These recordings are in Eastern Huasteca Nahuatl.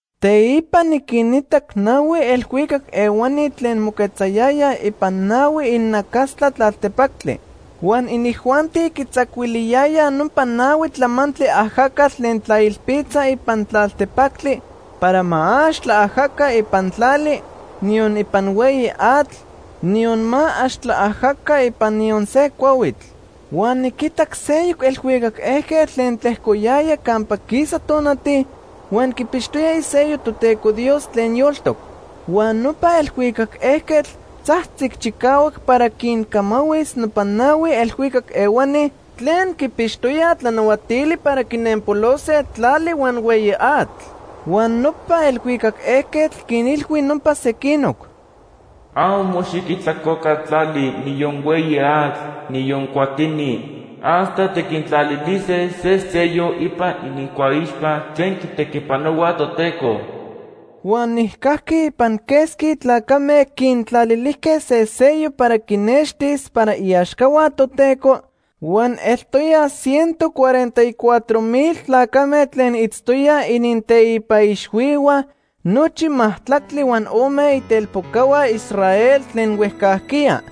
Teipa niquinitac nahui elhuicac ehuani tlen moquetzayayaj ipan nahui inacastla tlaltepactli. Huan inijuanti quitzacuiliyayaj nopa nahui tlamantli ajacatl tlen tlailpitza ipan tlaltepactli para ma ax tlaajaca ipan tlali, niyon ipan hueyi atl, niyon ma ax tlaajaca ipan niyon se cuahuitl. Huan niquitac seyoc elhuicac ejquetl tlen tlejcoyaya campa quisa tonati huan quipixtoya isello Toteco Dios tlen yoltoc. Huan nopa elhuicac ejquetl tzajtzic chicahuac para quincamahuis nopa nahui elhuicac ehuani tlen quipixtoyaj tlanahuatili para quinenpolose tlali huan hueyi atl. Huan nopa elhuicac ejquetl quinilhui nopa sequinoc: “Amo xiquijtlacoca tlali, niyon hueyi atl, niyon cuatini, hasta tiquintlalilise se sello ipan inincuaixpa tlen quitequipanohuaj Toteco.” Huan nijcajqui ipan quesqui tlacame quintlalilijque se sello para quinextis para iaxcahua Toteco huan eltoyaj ciento cuarenta y cuatro mil tlacame tlen itztoyaj ininteipa ixhuihua nochi majtlactli huan ome itelpocahua Israel tlen huejcajquiya.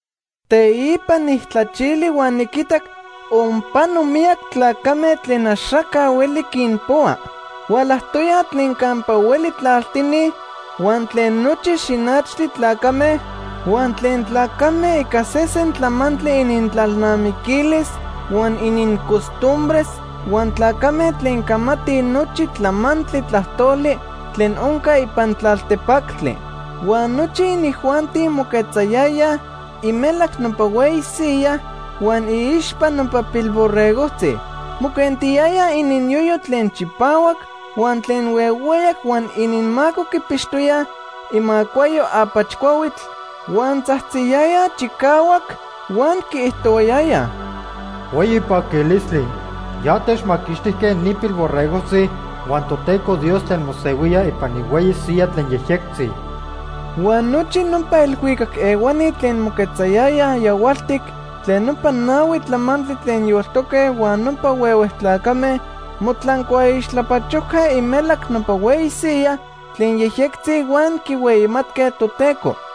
Teipa nijtlachili huan niquitac onpano miyac tlacame tlen axaca hueli quinpohua. Hualajtoyaj tlen campa hueli tlaltini, huan tlen nochi xinachtli tlacame, huan tlen tlacame ica sesen tlamantli inintlalnamiquilis huan inincostumbres, huan tlacame tlen camatij nochi tlamantli tlajtoli tlen onca ipan tlaltepactli. Huan nochi inijuanti moquetzayayaj imelac nopa hueyi siyaj huan iixpa nopa Pilborregojtzi. Moquentiyayaj ininyoyo tlen chipahuac huan tlen huehueyac huan ininmaco quipixtoyaj imacuayo apach cuahuitl, huan tzajtziyayaj chicahuac huan quiijtohuayayaj: “¡Hueyi paquilistli! Ya techmaquixtijque ni Pilborregojtzi huan Toteco Dios tlen mosehuía ipan ihueyi siyaj tlen yejyectzi.” Huan nochi nopa elhuicac ehuani tlen moquetzayayaj yahualtic tlen nopa nahui tlamantli tlen yoltoque huan nopa huehue tlacame motlancuaixtlapachojque imelac nopa hueyi siyaj tlen yejyectzi huan quihueyimatque Toteco.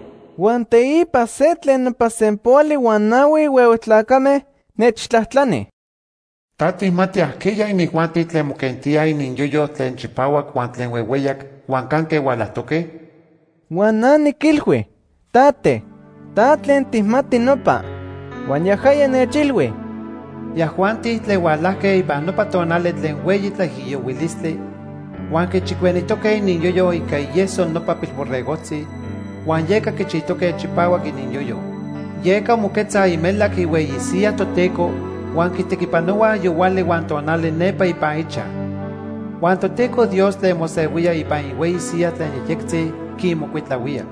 Huan teipa se tlen nopa sempoali huan nahui huehue tlacame nechtlajtlani: “¿Ta tijmati ajqueya inijuanti tlen moquentíaj ininyoyo tlen chipahuac huan tlen huehueyac, huan canque hualajtoque?” Huan na niquilhui: “Tate, ta tlen tijmati nopa.” Huan yajaya nechilhui: “Yajuanti tlen hualajque ipan nopa tonali tlen hueyi tlaijiyohuilistli huan quichicuenijtoque ininyoyo ica ieso nopa Pilborregojtzi, huan yeca quichijtoque chipahuac ininyoyo. “Yeca moquetzaj imelac ihueyi siyaj Toteco huan quitequipanohuaj yohuali huan tonali nepa ipan ichaj. Huan Toteco Dios tlen mosehuía ipan ihueyi siyaj tlen yejyectzi quinmocuitlahuía.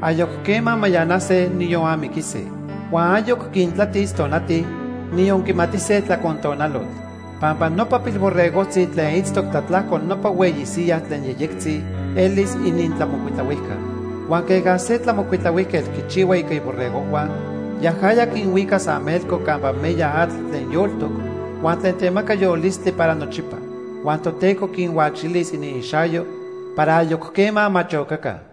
Ayoc quema mayanase, niyon amiquise. Huan ayoc quintlatis tonati, niyon quimatise tlacontonalotl. Pampa nopa Pilborregojtzi tlen itztoc tlatlajco nopa hueyi siyaj tlen yejyectzi elis inintlamocuitlahuijca. Huan queja se tlamocuitlahuijquetl quichihua ica iborregojhua, yajaya quinhuicas amelco campa meya atl tlen yoltoc huan tlen temaca yolistli para nochipa. Huan Toteco quinhuachilis iniixayo para ayoc quema ma chocaca.”